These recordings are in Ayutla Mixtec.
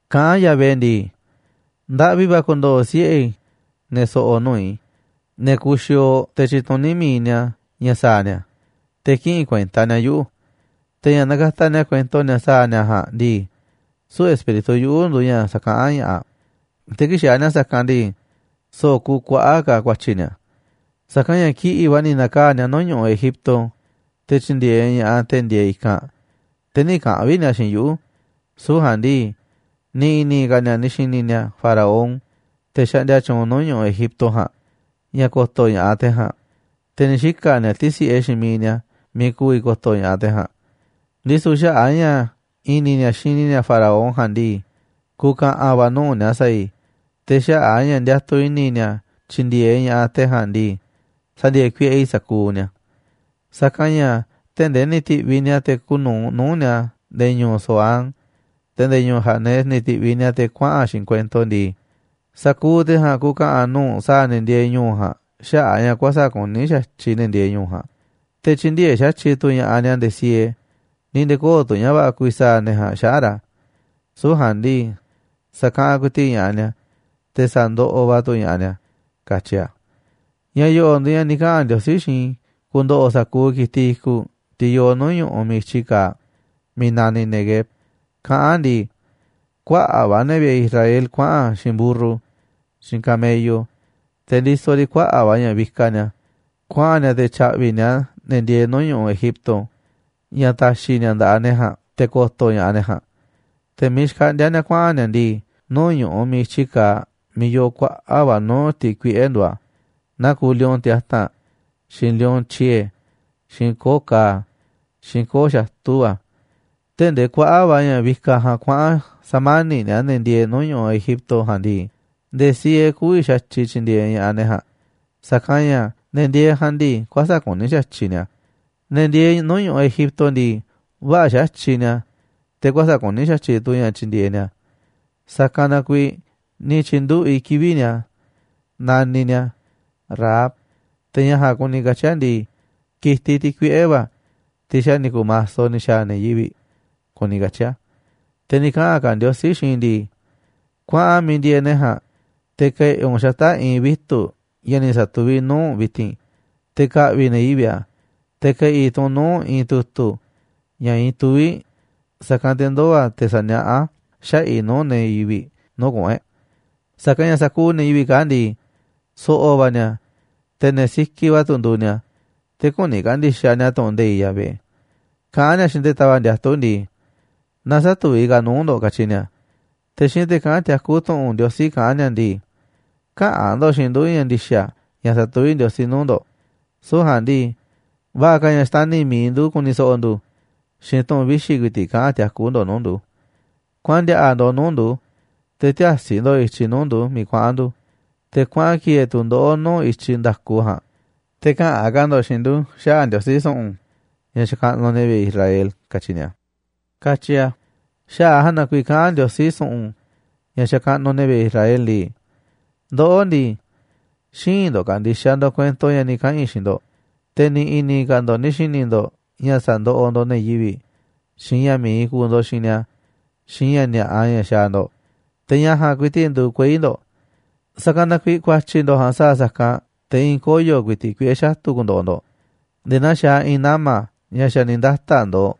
1fKaꞌán Yahvé ndii: “Ndaꞌvi va̱ ku̱ndo̱ꞌo̱ siꞌe̱ i̱, ne̱ so̱ꞌo̱ nuu̱ꞌ i̱, ne̱ kuxiooꞌ te̱ tyituní mi̱iꞌ ni̱a̱ ña̱ sa̱a̱ ni̱a̱, te̱ kïꞌinꞌ kuenta ni̱a̱ yuꞌu̱. Te̱ ña̱ nakataꞌ ni̱a̱ kuento ni̱a̱ sa̱a̱ ni̱a̱ ja̱a̱nꞌ ndii, süu̱ꞌ Espíritu yuꞌu̱ nduuꞌ ña̱ sa̱kaꞌán ña̱ꞌaꞌ, te̱ kii̱ꞌ xaaꞌ ni̱a̱ sa̱kanꞌ ndii, so̱ꞌo̱ kuuꞌ kuaꞌa̱ꞌ ka̱ ku̱a̱tyi̱ ni̱a̱. Sa̱kanꞌ ña̱ kiꞌi̱ꞌ va̱ ni̱ na̱kaa̱ꞌ ni̱a̱ nuu̱ꞌ ñu̱ꞌuꞌ Egipto, te̱ tyi̱ndi̱e̱eꞌ ña̱ꞌaꞌ te̱ ndieeꞌ i̱kanꞌ, te̱ nï̱ kaꞌa̱n vi̱ꞌ ni̱a̱ xiinꞌ yuꞌu̱. Süu̱ꞌ ja̱a̱nꞌ ndii, ni̱ i̱ni̱ ka̱ ni̱a̱ ni̱ xi̱ni̱ ni̱a̱ faraón, te̱ xaꞌndia tyuunꞌ nuu̱ꞌ ñu̱ꞌuꞌ Egipto ja̱a̱nꞌ, ña̱ ko̱to̱ ña̱ꞌaꞌ te̱ ja̱a̱nꞌ, te̱ ni̱ xika̱ ni̱a̱ ti̱si̱ꞌe xiinꞌ miiꞌ ni̱a̱ miiꞌ ku̱vi̱ ko̱to̱ ña̱ꞌaꞌ te̱ ja̱a̱nꞌ. Ndisu̱ xaꞌa̱ꞌ a̱ ña̱ i̱ni̱ ni̱a̱ xini ni̱a̱ faraón ja̱a̱nꞌ ndii, ku̱ka̱ꞌa̱n va̱ nuu̱ꞌ ni̱a̱ sa̱a̱ i̱, te̱ xaꞌa̱ꞌ a̱ ña̱ ndiatuꞌ i̱ni̱ ni̱a̱ tyi̱ndi̱e̱eꞌ ña̱ꞌaꞌ te̱ ja̱a̱nꞌ ndii, sa̱ndi̱e̱e̱ kuiꞌe i̱ sa̱kuuꞌ ni̱a̱. Sa̱kanꞌ ña̱ tee̱ꞌ ndee ni̱ ti̱ꞌviꞌ ni̱a̱ te̱ kuuꞌ nu̱uꞌ nuu̱ꞌ ni̱a̱ nde̱e̱ ñu̱u̱ Zoán, te̱ nde̱e̱ ñu̱u̱ Hanes ni̱ ti̱ꞌviꞌ ni̱a̱ te̱ kuaꞌa̱n xiinꞌ kuento ndii, sa̱kuuꞌ te̱ ja̱a̱nꞌ ku̱ka̱ꞌa̱n nuu̱ꞌ sa̱a̱ ne̱ ndieeꞌ ñu̱u̱ ja̱a̱nꞌ xaꞌa̱ꞌ a̱ ña̱ kuäsa̱ꞌ kuní xa̱tyiꞌ ne̱ ndieeꞌ ñu̱u̱ ja̱a̱nꞌ, te̱ tyï̱ndi̱e̱eꞌ xa̱tyiꞌ tu̱ ña̱ꞌaꞌ ni̱a̱ nde̱e̱ siee, ni̱ nde̱e̱ köo̱ꞌ tu̱ ña̱ va̱ꞌa̱ ku̱vi̱ sa̱a̱ ne̱ ja̱a̱nꞌ xaꞌa̱ꞌ ra̱. Süu̱ꞌ ja̱a̱nꞌ ndii, sa̱kaꞌanꞌ ku̱i̱ti̱ꞌ ña̱ꞌaꞌ ni̱a̱, te̱ sa̱ndoꞌoꞌ va̱ tu̱ ña̱ꞌaꞌ ni̱a̱”, katyi a̱. Ña̱ yo̱ꞌo̱ꞌ nduuꞌ ña̱ ni̱ kaꞌa̱n Ndiosí xiinꞌ i̱ ku̱ndo̱ꞌo̱ sa̱kuuꞌ ki̱tiꞌ i̱kuꞌ, tiꞌ yooꞌ nuu̱ꞌ ñu̱ꞌuꞌ miiꞌ i̱tyiꞌ kaaꞌ miiꞌ naniꞌ Neguev, kaꞌán a̱ ndii: “Kuaꞌa̱ꞌ va̱ ne̱ vi̱ꞌe̱ Israel kuaꞌa̱n xiinꞌ mburru xiinꞌ camello, te̱ ndisoꞌ riꞌ kuaꞌa̱ꞌ va̱ ña̱ vikaꞌ ni̱a̱, kuaꞌa̱n ni̱a̱ te̱ tya̱ꞌvi̱ ni̱a̱ ne̱ ndieeꞌ nuu̱ꞌ ñu̱ꞌuꞌ Egipto ña̱ ta̱xi̱ ni̱a̱ nda̱ꞌaꞌ ne̱ ja̱a̱nꞌ te̱ ko̱to̱ ña̱ꞌaꞌ ne̱ ja̱a̱nꞌ. Te̱ miiꞌ xkaꞌndíá ni̱a̱ kuaꞌa̱n ni̱a̱ ndii, nuu̱ꞌ ñu̱ꞌuꞌ miiꞌ i̱tyi kaaꞌ miiꞌ yooꞌ kuaꞌa̱ꞌ va̱ nuu̱ꞌ tiꞌ kuiꞌe̱ nduuꞌ a̱, naa kuuꞌ lion tiata̱nꞌ, xiinꞌ lion tyiee̱, xiinꞌ koo̱ꞌ ka̱a̱, xiinꞌ koo̱ꞌ xatu̱ va̱. Tee̱ꞌ ndee kuaꞌa̱ꞌ va̱ ña̱ vikaꞌ ja̱a̱nꞌ kuaꞌa̱n sa̱mani̱ꞌ ni̱a̱ ne̱ ndieeꞌ nuu̱ꞌ ñu̱ꞌuꞌ Egipto ja̱a̱nꞌ ndii, nde̱e̱ siee kü̱vi̱ xa̱tyiꞌ tyi̱ndi̱e̱eꞌ ña̱ꞌaꞌ ne̱ ja̱a̱nꞌ, sa̱kanꞌ ña̱ ne̱ ndieeꞌ ja̱a̱nꞌ ndii kuäsa̱ꞌ kuní xa̱tyiꞌ ni̱a̱. Ne̱ ndieeꞌ nuu̱ꞌ ñu̱ꞌuꞌ Egipto ndii, vä̱ꞌa̱ xa̱tyiꞌ ni̱a̱, te̱ kuäsa̱ꞌ kuní xa̱tyiꞌ tu̱ ña̱ tyindieeꞌ ni̱a̱. Sa̱kanꞌ na kuiiꞌ ni̱ tyi̱nduꞌu̱ꞌ i̱ kivi̱ꞌ ni̱a̱ naniꞌ ni̱a̱ Rahab, te̱ ña̱ ja̱a̱nꞌ kuni katyi̱ ndii, ki̱tiꞌ, tiꞌ kuiꞌe̱ va̱, tiꞌ xa̱ ni̱ ku̱maso ni̱ xa̱a̱ ne̱ yivi̱ꞌ, kuni katyi̱ a̱.” Te̱ ni̱ kaꞌa̱n ka̱ Ndiosí xiinꞌ i̱ ndii: “Kuaꞌan miiꞌ ndieeꞌ ne̱ ja̱a̱nꞌ, te̱ ke̱ꞌi̱ u̱nꞌ xata̱ꞌ i̱i̱n vitu̱ꞌ ña̱ ni̱ satuví i̱ nuu̱ꞌ u̱nꞌ vi̱ti̱n, te̱ ka̱ꞌvi̱ ne̱ yivi̱ꞌ a̱, te̱ ke̱ꞌi̱ tu̱ u̱nꞌ nuu̱ꞌ i̱i̱n tu̱tu̱ ña̱ iinꞌ tuvíꞌ, sa̱kanꞌ te̱ ndoo̱ a̱ te̱ saniaꞌá a̱ xaꞌa̱ꞌ i̱ nuu̱ꞌ ne̱ yivi̱ꞌ nuu̱ꞌ kuꞌu̱n e̱ꞌ. Sa̱kanꞌ ña̱ sa̱kuuꞌ ne̱ yivi̱ꞌ kaa̱ꞌ ndii, so̱ꞌo̱ va̱ ni̱a̱, te̱ ne̱ sikiꞌ va̱ tu̱ nduuꞌ ni̱a̱, te̱ küni ka̱ndi̱xaꞌ ni̱a̱ tu̱ꞌu̱n nde̱iꞌ Yahvé. Kaꞌán ni̱a̱ xiinꞌ te̱ tava̱ꞌ ndiatu̱ ndii: Na sä̱tuví ka̱ a̱ nuu̱ꞌ ndo̱ꞌ, katyi ni̱a̱. Te̱ xiinꞌ te̱ kaꞌán tiakú tu̱ꞌu̱n Ndiosí kaꞌán ni̱a̱ ndii: Käꞌa̱n ndo̱ꞌ xiinꞌ ndu̱ ña̱ ndi̱xa̱ ña̱ satuví Ndiosí nuu̱ꞌ ndo̱ꞌ, süu̱ꞌ ja̱a̱nꞌ ndii, va̱ꞌa̱ ka̱ ña̱ xtani̱ mi̱iꞌ ndu̱ ku̱ni̱ so̱ꞌo̱ ndu̱, xiinꞌ tu̱n vixi̱ ku̱i̱ti̱ꞌ kaꞌa̱n tiakú ndo̱ꞌ nuu̱ꞌ ndu̱. Kuaꞌan ndi̱a̱ꞌa̱ ndo̱ꞌ nuu̱ꞌ ndu̱, te̱ tiäsi ndo̱ꞌ i̱tyiꞌ nuu̱ꞌ ndu̱ꞌ miiꞌ kuaꞌa̱n ndu̱, te̱ kuaꞌan ki̱e̱e̱ tu̱ ndoꞌó nuu̱ꞌ i̱tyiꞌ nda̱ku ja̱a̱nꞌ, te̱ käꞌa̱n ka̱ ndo̱ꞌ xiinꞌ ndu̱ xaꞌa̱ꞌ Ndiosí su̱ꞌu̱n, ña̱ xakaꞌnuꞌ ne̱ vi̱ꞌe̱ Israel, katyi ni̱a̱”, katyi a̱. Xaꞌa̱ꞌ a̱ ja̱a̱nꞌ na kuiiꞌ kaꞌán Ndiosí su̱ꞌu̱n, ña̱ xakaꞌnuꞌ ne̱ vi̱ꞌe̱ Israel ndii: “Ndoꞌó ndii, xïinꞌ ndo̱ꞌ ka̱ndi̱xaꞌ ndo̱ꞌ kuento ña̱ ni̱ kaꞌa̱n i̱ xiinꞌ ndo̱ꞌ, te̱ ni̱ i̱ni̱ ka̱ ndo̱ꞌ ni̱ xi̱ni̱ ndo̱ꞌ ña̱ sandoꞌoꞌ ndo̱ꞌ ne̱ yivi̱ꞌ, xiinꞌ ña̱ mi̱iꞌ kuuꞌ ndo̱ꞌ xiinꞌ ni̱a̱, xiinꞌ ña̱ ni̱a̱ꞌa ña̱ xaaꞌ ndo̱ꞌ, te̱ ña̱ ja̱a̱nꞌ ku̱i̱ti̱ꞌ nduuꞌ kuei̱ ndo̱ꞌ. Sa̱kanꞌ na kuiiꞌ ku̱a̱tyi̱ ndo̱ꞌ ja̱a̱nꞌ sa̱a̱ sa̱kanꞌ te̱ i̱i̱n koyo̱ ku̱i̱ti̱ꞌ kuiꞌe̱ xatu̱ ku̱ndo̱ꞌo̱ ndo̱ꞌ nde̱e̱ naa xaaꞌ i̱i̱n nama̱ ña̱ xa̱ ni̱ ndata̱ꞌ ndo̱o̱,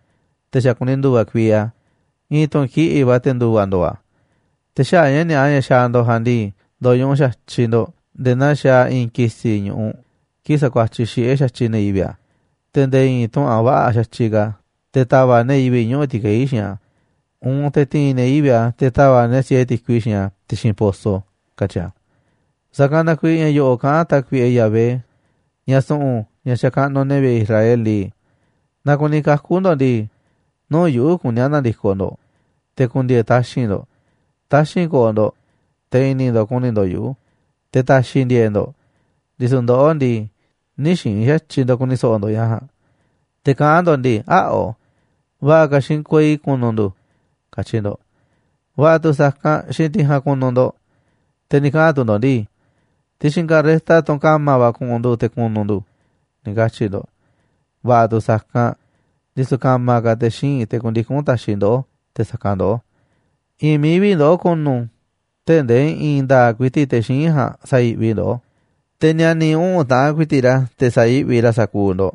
te̱ xa̱ kuni ndu̱va̱ kuii a̱, i̱i̱n tu̱n kiꞌi̱ꞌ va̱ te̱ ndu̱va̱ ndo̱o̱ a̱. Te̱ xaꞌa̱ꞌ ña̱ ni̱a̱ꞌa ña̱ xaaꞌ ndo̱ꞌ ja̱a̱nꞌ ndii, ndo̱ñuꞌuꞌ xa̱tyiꞌ ndo̱ꞌ nde̱e̱ naa xaaꞌ i̱i̱n ki̱si̱ ñu̱ꞌuꞌ kii̱ꞌ sakuatyiꞌ xiꞌe̱ xa̱tyiꞌ ne̱ yivi̱ꞌ a̱, te̱ nde̱e̱ i̱i̱n tuꞌu̱nꞌ a̱ vä̱ꞌa̱ xa̱tyiꞌ ka̱ te̱ ta̱va̱ꞌ ne̱ yivi̱ꞌ ñuꞌu̱ ti̱kei̱ xiinꞌ a̱, uun te̱ ti̱i̱n ne̱ yivi̱ꞌ a̱ te̱ ta̱va̱ꞌ ni̱a̱ siee ti̱kui xiinꞌ a̱ ti̱xi̱n poso”, katyi a̱. Sa̱kanꞌ na kuiiꞌ ña̱ yo̱ꞌo̱ꞌ kaꞌán Tákuiꞌe Yahvé, ña̱ su̱ꞌu̱n, ña̱ xakaꞌnuꞌ ne̱ vi̱ꞌe̱ Israel ndii: “Naaꞌ kuni kaku̱ ndo̱ꞌ ndii, nuu̱ꞌ yuꞌu̱ kuní a̱ na̱ndi̱koꞌ ndo̱ꞌ, te̱ ku̱ndi̱e̱e̱ taxi̱nꞌ ndo̱ꞌ. Taxi̱nꞌ ko̱o̱ ndo̱ꞌ, te̱ i̱ni̱ ndo̱ꞌ ku̱ni̱ ndo̱ꞌ yuꞌu̱, te̱ ta̱xi̱ i̱ ndi̱e̱e̱ꞌ ndo̱ꞌ. Ndisu̱ ndoꞌó ndii, nï̱ xiinꞌ xa̱tyiꞌ ndo̱ꞌ ku̱ni̱ so̱ꞌo̱ ndo̱ꞌ ña̱ ja̱a̱nꞌ. Te̱ kaꞌán ndo̱ꞌ ndii: Äa̱ꞌo, va̱ꞌa̱ ka̱ xiinꞌ kuei ku̱nu̱ ndu̱, katyi ndo̱ꞌ. Va̱ꞌa̱ tu̱ sa̱kanꞌ, xiinꞌ tiꞌ ja̱a̱nꞌ ku̱nu̱ ndo̱ꞌ. Te̱ ni̱ kaꞌa̱n tu̱ ndo̱ꞌ ndii: Ti̱xi̱n carreta, tunꞌ ka̱ma̱ va̱, ku̱ꞌu̱n ndu̱ te̱ ku̱nu̱ ndu̱, ni̱ katyi̱ ndo̱ꞌ. Va̱ꞌa̱ tu̱ sa̱kanꞌ, ndisu̱ ka̱ma̱ ka̱ te̱ xíinꞌ, te̱ ku̱ndiku̱n ta̱xiꞌ ndoꞌó te̱ sa̱kanꞌ ndoꞌó. I̱i̱n mií vi̱ꞌ ndoꞌó ku̱nu̱ tee̱ꞌ ndee i̱i̱n nda̱a̱ꞌ ku̱i̱ti̱ꞌ te̱ xíinꞌ ja̱a̱nꞌ sa̱yi̱ꞌvi ndoꞌó, te̱ ni̱a̱ni̱ uꞌu̱n taꞌan ku̱i̱ti̱ꞌ ra̱ sa̱yi̱ꞌvi ra̱ sa̱kuuꞌ ndo̱ꞌ,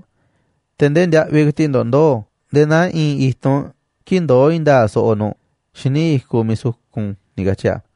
te̱ ndee ndiaꞌviꞌ ku̱i̱ti̱ꞌ ndo̱ꞌ ndoo̱ nde̱e̱ naa i̱i̱n i̱tunꞌ kii̱ꞌ ndoó i̱i̱n nda̱a̱ꞌ soꞌoꞌ nu̱ꞌ xíniꞌ i̱kuꞌ miiꞌ sukun”, ni̱ katyi̱ a̱.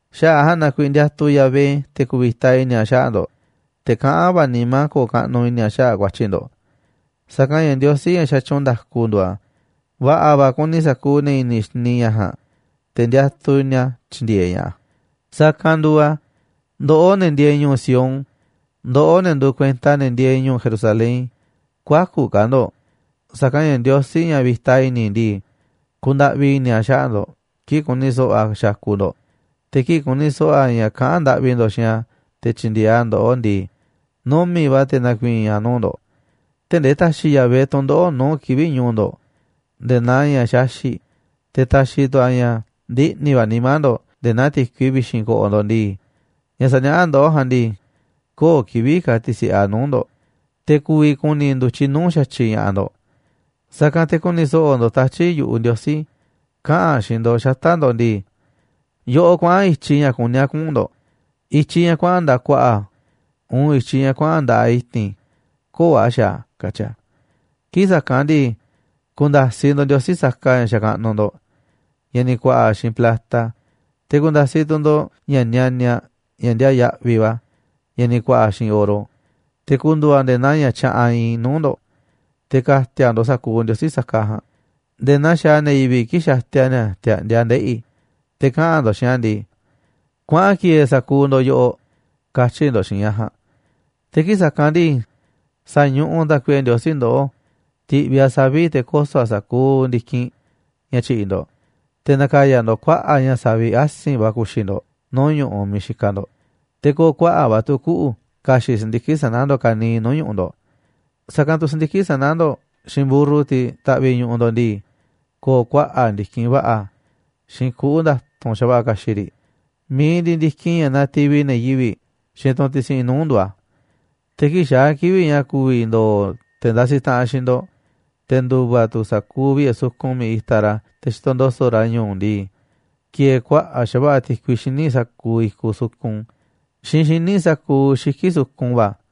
Xaꞌa̱ꞌ ja̱a̱nꞌ na kuiiꞌ ndiatuꞌ Yahvé, te̱ ku̱vi̱ta i̱ni̱ a̱ xaꞌa̱ꞌ ndo̱ꞌ, te̱ kaꞌán va̱ nimá a̱ ko̱o̱ kaꞌnuꞌ i̱ni̱ a̱ xaꞌa̱ꞌ ku̱a̱tyi̱ ndo̱ꞌ. Sa̱kanꞌ ña̱ Ndiosí ña̱ xatyuunꞌ nda̱ku nduuꞌ a̱. Va̱ꞌa̱ va̱ kuni sa̱kuuꞌ ne̱ i̱ni̱ xini ña̱ ja̱a̱nꞌ, te̱ ndiatuꞌ ni̱a̱ tyi̱ndi̱e̱eꞌ ña̱ꞌaꞌ. Sa̱kanꞌ nduuꞌ a̱, ndoꞌó, ne̱ ndieeꞌ ñu̱u̱ Sión, ndoꞌó, ne̱ nduuꞌ kuenta ne̱ ndieeꞌ ñu̱u̱ Jerusalén, kü̱a̱ku̱ ka̱ ndo̱ꞌ. Sa̱kanꞌ ña̱ Ndiosí, ña̱ vi̱ta i̱ni̱ ndii, kundaꞌvi i̱ni̱ a̱ xaꞌa̱ꞌ ndo̱ꞌ kii̱ꞌ ku̱ni̱ so̱ꞌo̱ a̱ xakuꞌ ndo̱ꞌ, te̱ kii̱ꞌ ku̱ni̱ so̱ꞌo̱ a̱ ña̱ kaꞌán ndaꞌvi ndo̱ꞌ xiinꞌ a̱ te̱ tyi̱ndi̱e̱eꞌ a̱ ndo̱ꞌoꞌ ndii, numi̱ꞌ va̱ te̱ na̱ku̱i̱i̱n a̱ nuu̱ꞌ ndo̱ꞌ. Tee̱ꞌ ndee ta̱xi̱ Yahvé tu̱ndoꞌo̱ꞌ nuu̱ꞌ kivi̱ꞌ ñu̱u̱ ndo̱ꞌ nde̱e̱ naa ña̱ xaxi̱ꞌ, te̱ ta̱xi̱ tu̱ a̱ ña̱ ndiꞌni̱ va̱ nimá ndo̱ꞌ nde̱e̱ naa ti̱kui vi̱xi̱n ko̱ꞌo̱ ndo̱ꞌ ndii, ña̱ saniaꞌá ndoꞌó ja̱a̱nꞌ ndii, köo̱ꞌ kivi̱ꞌ ka̱ ti̱si̱ꞌe a̱ nuu̱ꞌ ndo̱ꞌ, te̱ ku̱vi̱ ku̱ni̱ ndu̱tyiꞌ nuu̱ꞌ xa̱tyiꞌ ña̱ꞌaꞌ ndo̱ꞌ. Sa̱kanꞌ te̱ ku̱ni̱ so̱ꞌo̱ ndo̱ꞌ tatyi̱ꞌ yu̱ꞌuꞌ Ndiosí kaꞌa̱n a̱ xiinꞌ ndo̱ꞌ xata̱ꞌ ndo̱ꞌ ndii: “Yoꞌoꞌ kuaꞌa̱n i̱tyiꞌ ña̱ kuní a̱ kuꞌu̱n ndo̱ꞌ, i̱tyiꞌ ña̱ kuaꞌa̱n nda̱ꞌaꞌ ku̱a̱ꞌa̱ uun i̱tyiꞌ ña̱ kuaꞌa̱n nda̱ꞌaꞌ i̱ti̱n köo̱ꞌ a̱ xaaꞌ a̱”, katyi̱ a̱. Kii̱ꞌ sa̱kanꞌ ndii, ku̱nda̱siꞌ ndo̱ꞌ ndiosí saka ña̱ xakaꞌnuꞌ ndo̱ꞌ, ña̱ ni̱ ku̱a̱ꞌa̱ xiinꞌ plata, te̱ ku̱nda̱siꞌ tu̱ ndo̱ꞌ ña̱ nianiaꞌ, ña̱ ndiaa yaꞌviꞌ va̱, ña̱ ni̱ ku̱a̱ꞌa̱ xiinꞌ oro, te̱ ku̱ndu̱u̱ a̱ nde̱e̱ naa ña̱ tyaꞌanꞌ iinꞌ nuu̱ꞌ ndo̱ꞌ. Te̱ ka̱ti̱a̱ ndo̱ꞌ sa̱kuuꞌ ndiosí saka ja̱a̱nꞌ nde̱e̱ naa xaaꞌ ne̱ yivi̱ꞌ kii̱ꞌ xatia ni̱a̱ ti̱a̱ꞌndia ndeꞌi̱, te̱ kaꞌa̱n ndo̱ꞌ xiinꞌ a̱ ndii: “Kuaꞌan ki̱e̱e̱ sa̱kuuꞌ ndo̱ꞌ yoꞌoꞌ”, katyi̱ ndo̱ꞌ xiinꞌ ña̱ ja̱a̱nꞌ. Te̱ kii̱ꞌ sa̱kanꞌ ndii, sa̱ñuꞌuꞌ Tákuiꞌe Ndiosí ndoꞌó ti̱ꞌviꞌ a̱ savi̱ꞌ te̱ koso̱ a̱ sa̱kuuꞌ ndi̱kinꞌ ña̱ tyi̱ꞌi̱ ndo̱ꞌ, te̱ na̱ka̱ya̱ ndo̱ꞌ kuaꞌa̱ꞌ ña̱ savi̱ꞌ asi̱nꞌ va̱ ku̱xi̱ ndo̱ꞌ nuu̱ꞌ ñu̱ꞌuꞌ miiꞌ xikaꞌ ndo̱ꞌ, te̱ ko̱o̱ kuaꞌa̱ꞌ va̱ tu̱ kuꞌu̱ ka̱xi̱ꞌ si̱ndiki̱ꞌ sana̱ ndo̱ꞌ ka̱niiꞌ nuu̱ꞌ ñu̱ꞌuꞌ ndo̱ꞌ. Sa̱kanꞌ tu̱ si̱ndiki̱ꞌ sana̱ ndo̱ꞌ xiinꞌ mburru, tiꞌ taꞌviꞌ ñu̱ꞌuꞌ ndo̱ꞌ ndii, ko̱o̱ kuaꞌa̱ꞌ ndi̱kinꞌ va̱ꞌa̱ xiinꞌ kuꞌu̱ nda̱tu̱nꞌ xa̱va̱ꞌa̱ ka̱xi̱ꞌ riꞌ mi̱iꞌ ndiꞌiꞌ ndi̱kinꞌ ña̱ nativi ne̱ yivi̱ꞌ xiinꞌ tunꞌ tisiꞌin nuu̱ꞌ nduuꞌ a̱. Te̱ kii̱ꞌ xaa̱ kivi̱ꞌ ña̱ ku̱vi̱ ndo̱o̱ te̱ ndasiꞌ taꞌanꞌ xiinꞌ ndo̱ꞌ, te̱ ndu̱va̱ tu̱ sa̱kuuꞌ vi̱ꞌe̱ sukun miiꞌ itaꞌ ra̱ te̱ xitoꞌ ndo̱so̱ꞌ ra̱ ñu̱u̱ ndii, ki̱e̱e̱ kuaꞌa̱ꞌ xa̱va̱ꞌa̱ ti̱kui xíniꞌ sa̱kuuꞌ i̱kuꞌ sukun xiinꞌ xíniꞌ sa̱kuuꞌ xiki̱ꞌ sukun va̱.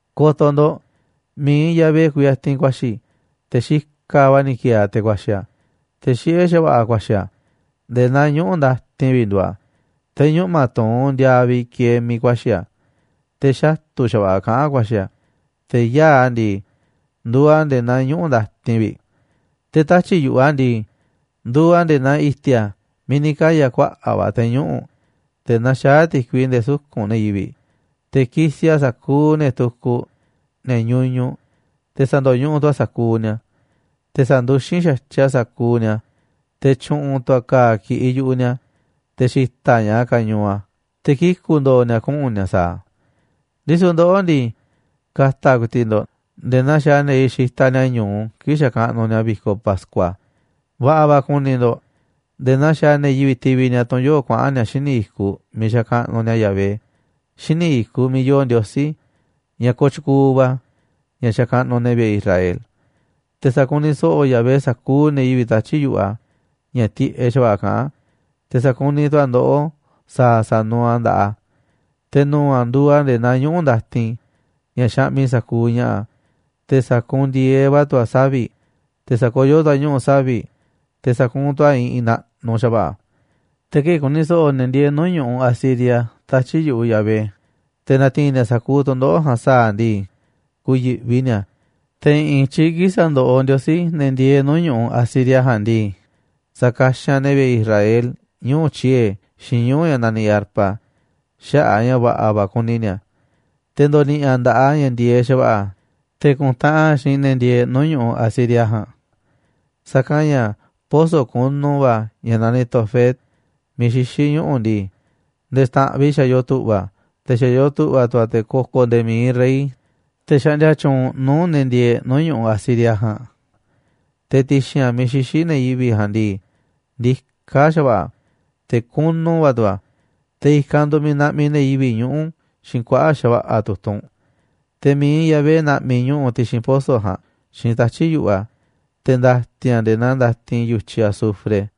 Ko̱to̱ ndo̱ꞌ, mi̱iꞌ Yahvé kuyatinꞌ ku̱a̱xi̱, te̱ xikaꞌ va̱ ni̱ ki̱e̱e̱ a̱ te̱ ku̱a̱xi̱ a̱, te̱ xiꞌé xa̱va̱ꞌa̱ a̱ ku̱a̱xi̱ a̱, nde̱e̱ naa ñuꞌu̱ ndatin vi̱ꞌ nduuꞌ a̱, te̱ ñuꞌma̱ tuu̱nꞌ ndiaaꞌ vi̱ꞌ kieeꞌ miiꞌ ku̱a̱xi̱ a̱. Te̱ xatu̱ xa̱va̱ꞌa̱ kaꞌán ku̱a̱xi̱ a̱, te̱ yaa̱ꞌ a̱ ndii, nduuꞌ a̱ nde̱e̱ naa ñuꞌu̱ ndatin vi̱ꞌ. Te̱ tatyi̱ꞌ yu̱ꞌuꞌ a̱ ndii, nduuꞌ a̱ nde̱e̱ naa i̱ti̱a̱ miiꞌ ni̱ kaya̱ kuaꞌa̱ꞌ va̱ te̱ ñuꞌu̱, te̱ naxaá ti̱kui nde̱e̱ suku̱nꞌ ne̱ yivi̱ꞌ. Te̱ ki̱si̱ a̱ sa̱kuuꞌ ne̱ tukuꞌ, ne̱ ñuñuꞌ, te̱ sa̱ndo̱ñuꞌuꞌ tu̱ a̱ sa̱kuuꞌ ni̱a̱. Te̱ sa̱nduxín xa̱tyiꞌ a̱ sa̱kuuꞌ ni̱a̱, te̱ tyu̱ꞌu̱n tu̱ a̱ ka̱a̱ ki̱ꞌiꞌ yu̱ꞌuꞌ ni̱a̱, te̱ xi̱ta̱ꞌ ña̱ꞌaꞌ a̱ kañuuꞌ a̱ te̱ kiku̱ ndo̱o̱ ni̱a̱ kuꞌu̱n ni̱a̱ sa̱a̱ a̱. Ndisu̱ ndoꞌó ndii, ka̱ta̱ ku̱i̱ti̱ꞌ ndo̱ꞌ nde̱e̱ naa xaaꞌ ne̱ yivi̱ꞌ xitaꞌ ni̱a̱ ñu̱u kii̱ꞌ xakaꞌnuꞌ ni̱a̱ vi̱koꞌ pascua. Va̱ꞌa̱ va̱ ku̱ni̱ ndo̱ꞌ nde̱e̱ naa xaaꞌ ne̱ yivi̱ꞌ tivi ni̱a̱ tunꞌ yoo̱ꞌ kuaꞌa̱n ni̱a̱ xíniꞌ i̱kuꞌ miiꞌ xakaꞌnuꞌ ni̱a̱ Yahvé, xíniꞌ i̱kuꞌ miiꞌ yoo Ndiosí ña̱ kooꞌ tyukuuꞌ va̱, ña̱ xakaꞌnuꞌ ne̱ vi̱ꞌe̱ Israel. Te̱ sa̱kuniꞌ so̱ꞌo̱ Yahvé sa̱kuuꞌ ne̱ yivi̱ꞌ tatyi̱ꞌ yu̱ꞌuꞌ a̱ ña̱ tiꞌeꞌ xa̱va̱ꞌa̱ kaꞌán a̱, te̱ sa̱kuniꞌ tu̱ a̱ ndoꞌó sa̱a̱ sa̱nuuꞌ a̱ nda̱ꞌaꞌ a̱. Te̱ nu̱u̱ a̱ nduuꞌ a̱ nde̱e̱ naa ñuꞌu̱ ndatin ña̱ xaꞌmiꞌ sa̱kuuꞌ ña̱ꞌa̱, te̱ sa̱kuunꞌ ndi̱e̱eꞌ va̱ tu̱ a̱ savi̱ꞌ, te̱ sa̱koyó tu̱ a̱ ñuꞌu̱ savi̱ꞌ, te̱ sa̱kuunꞌ tu̱ a̱ iꞌinꞌ naꞌnuꞌ xa̱va̱ꞌa̱. Te̱ kii̱ꞌ ku̱ni̱ so̱ꞌo̱ ne̱ ndieeꞌ nuu̱ꞌ ñu̱ꞌuꞌ Asiria tatyi̱ꞌ yu̱ꞌuꞌ Yahvé, te̱ na̱ti̱i̱n ni̱a̱ sa̱kuuꞌ tu̱ndoꞌo̱ꞌ ja̱a̱nꞌ sa̱a̱ a̱ ndii, ku̱yi̱ꞌvi ni̱a̱. Te̱ i̱ꞌi̱n i̱tyiꞌ kii̱ꞌ sa̱ndoꞌoꞌ Ndiosí ne̱ ndieeꞌ nuu̱ꞌ ñu̱ꞌuꞌ Asiria ja̱a̱nꞌ ndii, sa̱kaxanꞌ ne̱ vi̱ꞌe̱ Israel ñuu̱ꞌ tyiee̱ xiinꞌ ñuu̱ꞌ ña̱ naniꞌ arpa xaꞌa̱ꞌ a̱ ña̱ va̱ꞌa̱ va̱ kuni ni̱a̱. Te̱ ndo̱ni̱ꞌi̱ a̱ nda̱ꞌaꞌ a̱ ña̱ ndi̱e̱eꞌ xa̱va̱ꞌa̱ te̱ ku̱ntaꞌanꞌ a̱ xiinꞌ ne̱ ndieeꞌ nuu̱ꞌ ñu̱ꞌuꞌ Asiria ja̱a̱nꞌ. Sa̱kanꞌ ña̱ poso̱ kunu va ña̱ naniꞌ Tofet miiꞌ xixí ñuꞌu̱ ndii, nde̱e̱ xta̱ꞌanꞌ vi̱ꞌ xa̱ yoo tu̱ꞌva̱ a̱, te̱ xa̱ yoo tu̱ꞌva̱ tu̱ a̱ te̱ ko̱ko̱ nde̱e̱ mi̱iꞌ rey, te̱ xaꞌndia tyuunꞌ nuu̱ꞌ ne̱ ndieeꞌ nuu̱ꞌ ñu̱ꞌuꞌ Asiria ja̱a̱nꞌ. Te̱ ti̱xi̱n a̱ miiꞌ xixí ne̱ yivi̱ꞌ ja̱a̱nꞌ ndii, ndiká xa̱va̱ꞌa̱ a̱, te̱ kunu va̱ tu̱ a̱, te̱ i̱kanꞌ nduuꞌ miiꞌ naꞌmiꞌ ne̱ yivi̱ꞌ ñuꞌu̱ xiinꞌ kuaꞌa̱ꞌ xa̱va̱ꞌa̱ tu̱tunꞌ. Te̱ mi̱iꞌ Yahvé na̱ꞌmi̱ ñuꞌu̱ ti̱xi̱n poso̱ ja̱a̱nꞌ xiinꞌ tatyi̱ꞌ yu̱ꞌuꞌ a̱, te̱ nda̱ti̱n a̱ nde̱e̱ naa ndatin yu̱tyiꞌ azufre.